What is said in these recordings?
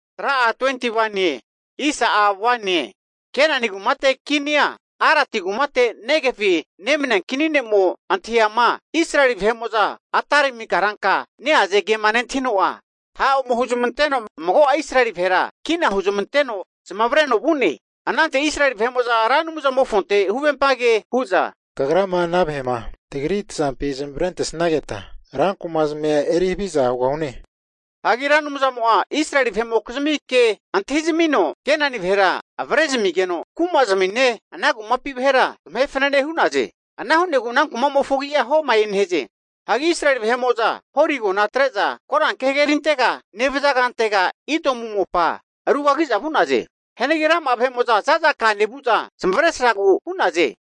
Hagi Kenani kumate kinia Arati kumate Negevi nemania kini ne'mo antahiama Israeli vahe'mo'za Atarimi karanka neaze hazankema nentahino'a, ha' ome huzamanteno mago'a Israeli vahera kina huzamanteno zamavareno vu'ne. Anante Israeli vahe'mo'za Ra Anumzamofonte huvempa ke hu'za, Kagrama ana vahe'ma tagri tazampi zamavarentesanketa rankumazmia eri haviza hugahune. Hagi Ra Anumzamo'a Israeli vahe'mokizmi ke antahizamino Kenani vahera avrezamigeno, kumazmine, ana kumapi vahera zamahe fanane hu'naze. Ana hu'negu ana kuma'mofo agi'a Homae nehaze. Hagi Israeli vahe'mo'za Hori agona atre'za koranke hagerintega nevaza kantega, Idomu mopa rugagi'za vu'naze. Hianagi rama'a vahe'mo'za zaza ka nevu'za, zamavaresragu hu'naze.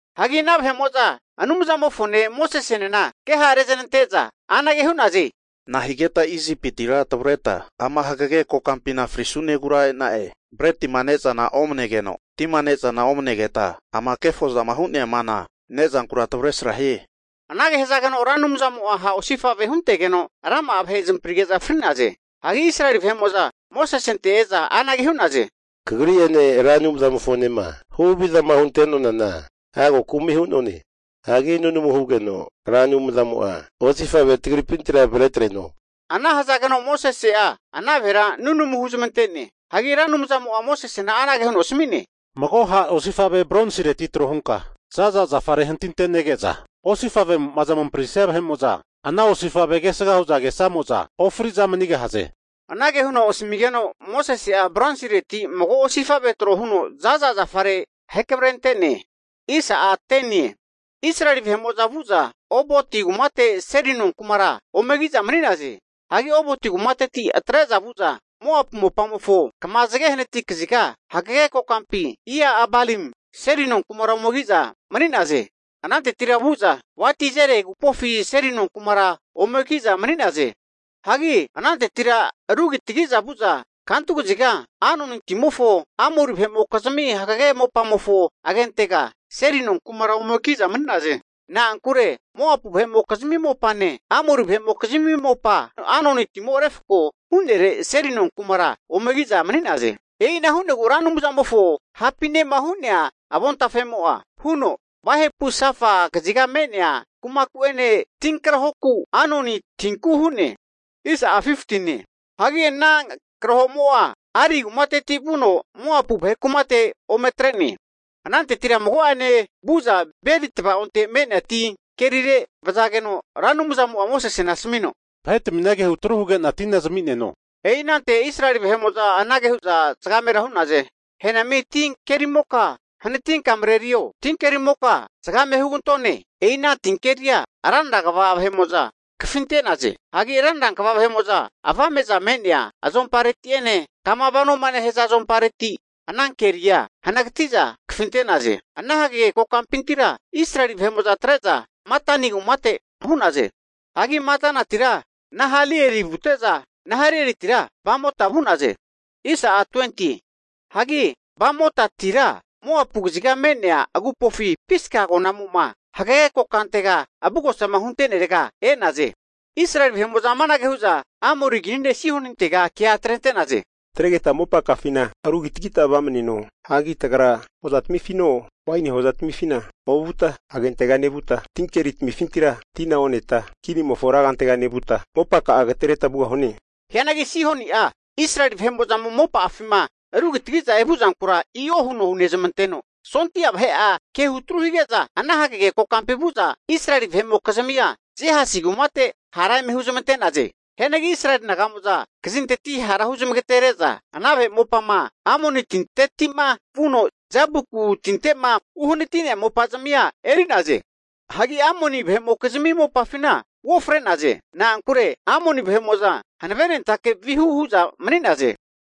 Hagi ana vahe'mo'za Anumzamofone Mosesenena ke ha'reneznante'za anage hu'naze, Nahigeta Isipitira tavreta ama hagege kokampina frisunegura e'na'e? Bretima ne'zana omanegeno, tima ne'zana omanegeta ama kefozama hu'nea mana nezankura tavresra hie! Anage hazageno Ra Anumzamo'a ha' osifave huntegeno rama'a vahe zamaprige'za fri'naze. Hagi Israeli vahe'mo'za Mosesente e'za anage hu'naze, kagri'ene Ra Anumzamofonema huhavizama hunte'nonana, hago kumi hu'none. Hagi nunamu hugeno Ra Anumzamo'a osifavea tagripintira avretreno. Anage hazageno Mosese'a ana vahera nunamuna huzamante'ne. Hagi Ra Anumzamo'a Mosesena anage huno asami'ne. Mago ha' osifave bronsireti trohunka zaza zafare hantintenege'za osifavemo'ma zamaprisia vahe'mo'za ana osifavema kesga hu'za kesamo'za ofri'za manigahaze. Anage huno asamigeno Mosese'a bronsireti mago osifave tro huno za'za zafare ahekamarente'ne. Israeli vahe'mo'za vu'za Oboti kumate seli nonkumara omeki'za mani'naze. Hagi Oboti kumatetira atre'za vu'za Moapu mopamofo kama zage hanati kaziga hagege kokampi Ia-abarim seli nonkumara ome ki'za mani'naze. Anantetira vu'za Wadi Zere agupofi seli nonkumara omeki'za mani'naze. Hagi anantetira rugitagiza vu'za kantu kaziga Arnoni timofo Amori vahe'mokizmi hagage mopamofo agentega seli nonkumara ome ki'za mani'naze. Na'ankure Moapu vahe'mokizmi mopane, Amori vahe'mokizmi mopa Arnoni timo refko hu'nere seli nonkumara omeki'za mani'naze. E'ina hu'negu Ra Anumzamofo hapinema hu'nea avontafemo'a huno, Wahepu Safa kaziga me'nea kumaku'ene tinkrahoku Arnoni tinku hu'ne. Hagi ana karahomo'a Ari kumateti vuno, Moapu vahe kumate ome atre'ne. Anantetira mago'ane vu'za Beri tava'onte me'nea tin kerire vazageno Ra Anumzamo'a Mosesena asamino, vahetamina kehutru huge'na tina zami'neno. E'i anante Israeli vahe'mo'za anage hu'za zagamera hu'naze, henami ti kerimoka hanatinka marerio, tinkerimoka! Zgame hugantone! E'ina tinkeria ranra kva vahe'mo'za kafinte'naze. Hagi rankva vahe'mo'za avame'za me'nea azompareti'ene kama vanoma nehaza azompareti anankeria hanagati'za kafinte'naze. Ana hagege kokampintira Israeli vahe'mo'za atre'za Matana kumate vu'naze. Hagi Matanatira Nahaliel vute'za, Nahalielitira Bamota vu'naze. Hagi Bamotitira Moapu kaziga me'nea agupofi Piska agonamo'ma hagege kokantega avugosama hunte'nerega e'naze. Israeli vahe'mo'za amanage hu'za Amori kini ne' Sihonintega kea atrente'naze, Tatregeta mopakafina rugitagita vamaneno. Hagi tagra hoza tamifino, waini hozatamifina ovuta, agentega nevuta, tinkeri tamifintira tina oneta kinimofo rankantega nevuta, mopaka'a agatereta vugahune. Hianagi Sihoni'a Israeli vahe'mo'zama mopa'afima rugitagiza evu'zankura i'o huno hunezmanteno, sondi'a vahe'a kehu atru hige'za, ana hagege kokampi vu'za Israeli vahe'mokizmia Jehasi kumate hara eme huzamante'naze. Hianagi Israeli naga'mo'za kazinteti hara huzamagatere'za, ana vahe mopama Amoni tinte'ma vuno Jaboku tinteti'ma uhanati'nea mopa'zmia eri'naze. Hagi Amoni vahe'mokizmi mopafina uofre'naze. Na'ankure Amoni vahe'mo'za hanavenentake vihu hu'za mani'naze.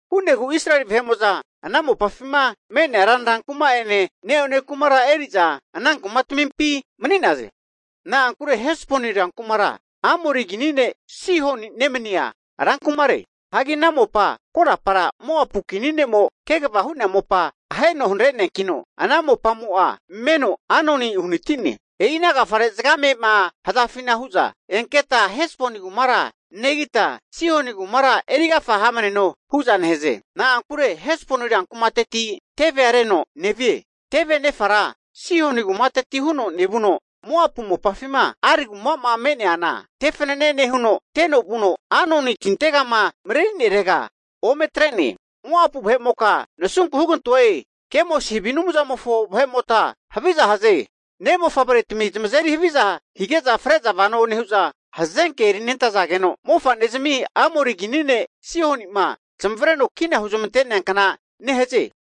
Hu'negu Israeli vahe'mo'za ana mopafima me'nea ranra kuma'ene, neone kumara eri'za ana kumatamimpi mani'naze. Na'ankure Hesboni rankumara Amori kini ne' Sihoni nemania rankumare. Hagi ana mopa korapara Moapu kini ne'mo kegava hu'nea mopa aheno hanare'neankino, ana mopamo'a meno Arnoni uhanati'ne. E'ina agafare zagamema hazafina hu'za, enketa Hesboni kumara negita, Sihoni kumara erigafa hamaneno hu'za nehaze. Na'ankure Hesboni rankumateti tevea reno nevie. Teve anefara Sihoni kumateti huno nevuno, Moapu mopafima Ar kumama me'neana tefanane nehuno, teno vuno Arnoni tintegama marerinerega ome atre'ne. Moapu vahe'moka nasunku hugantoe! Kemosi havi anumzamofo vahe'mota haviza haze! Ne'mofavretami zamazeri haviza hige'za fre'za vano nehu'za hazanke erinentazageno, mofanezmia Amori kini ne' Sihoni'ma zamavareno kina huzmanteankna nehaze.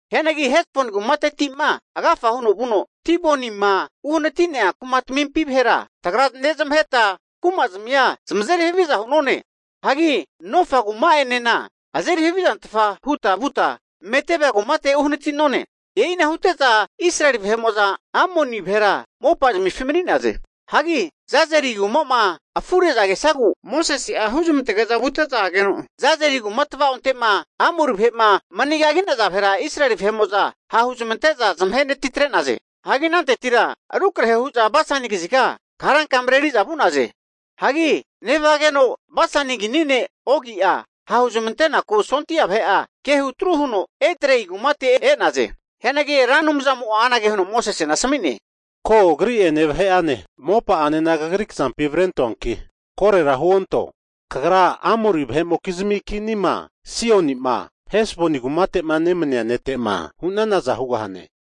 Hianagi Hesboni kumatetima agafa huno vuno Dibonima uhanati'nea kumatamimpi vahera tagra nezamaheta, kumazmia zamazeri haviza hu'none. Hagi Nofa kuma'enena azeri havizantfa huta vuta Medeba kumate uhanati'none. E'ina hute'za Israeli vahe'mo'za Amori vahe mopafina mani'naze. Hagi Jazeri kumama afure'za kesazegu Mosese'a huzmantege'za vute'za ageno, Jazeri kuma tava'onte'ma Amori vahe'ma mani kagi'naza vahera Israeli vahe'mo'za ha'huzamante'za zamahe natitre'naze. Hagi anantetira rukrahe hu'za Basani kaziga karanka mareri'za vu'naze. Hagi nevazageno Basani kini ne' Ogi'a ha'huzamante'naku sondia vahe'a kehutru hige'za Ederi kumate e'naze. Hianagi Ra Anumzamo'a anage huno Mosesena asmi'ne, Ko agri'ene vahe'ane mopa'anena kagri kazampi avrentoanki korera huonto. Kagra Amori vahe'mokizmi kinima Sihoni'ma Hesboni kumate'ma nemania nete'ma hu'nanaza hugahane.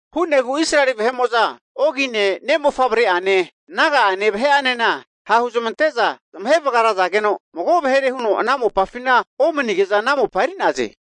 Hu'negu Israeli vahe'mo'za Ogine ne' mofavre'ane naga'ane vahe'anena ha'huzamante'za zamahe vagarazageno, mago vahere huno ana mopafina omanige'za ana mopa eri'naze.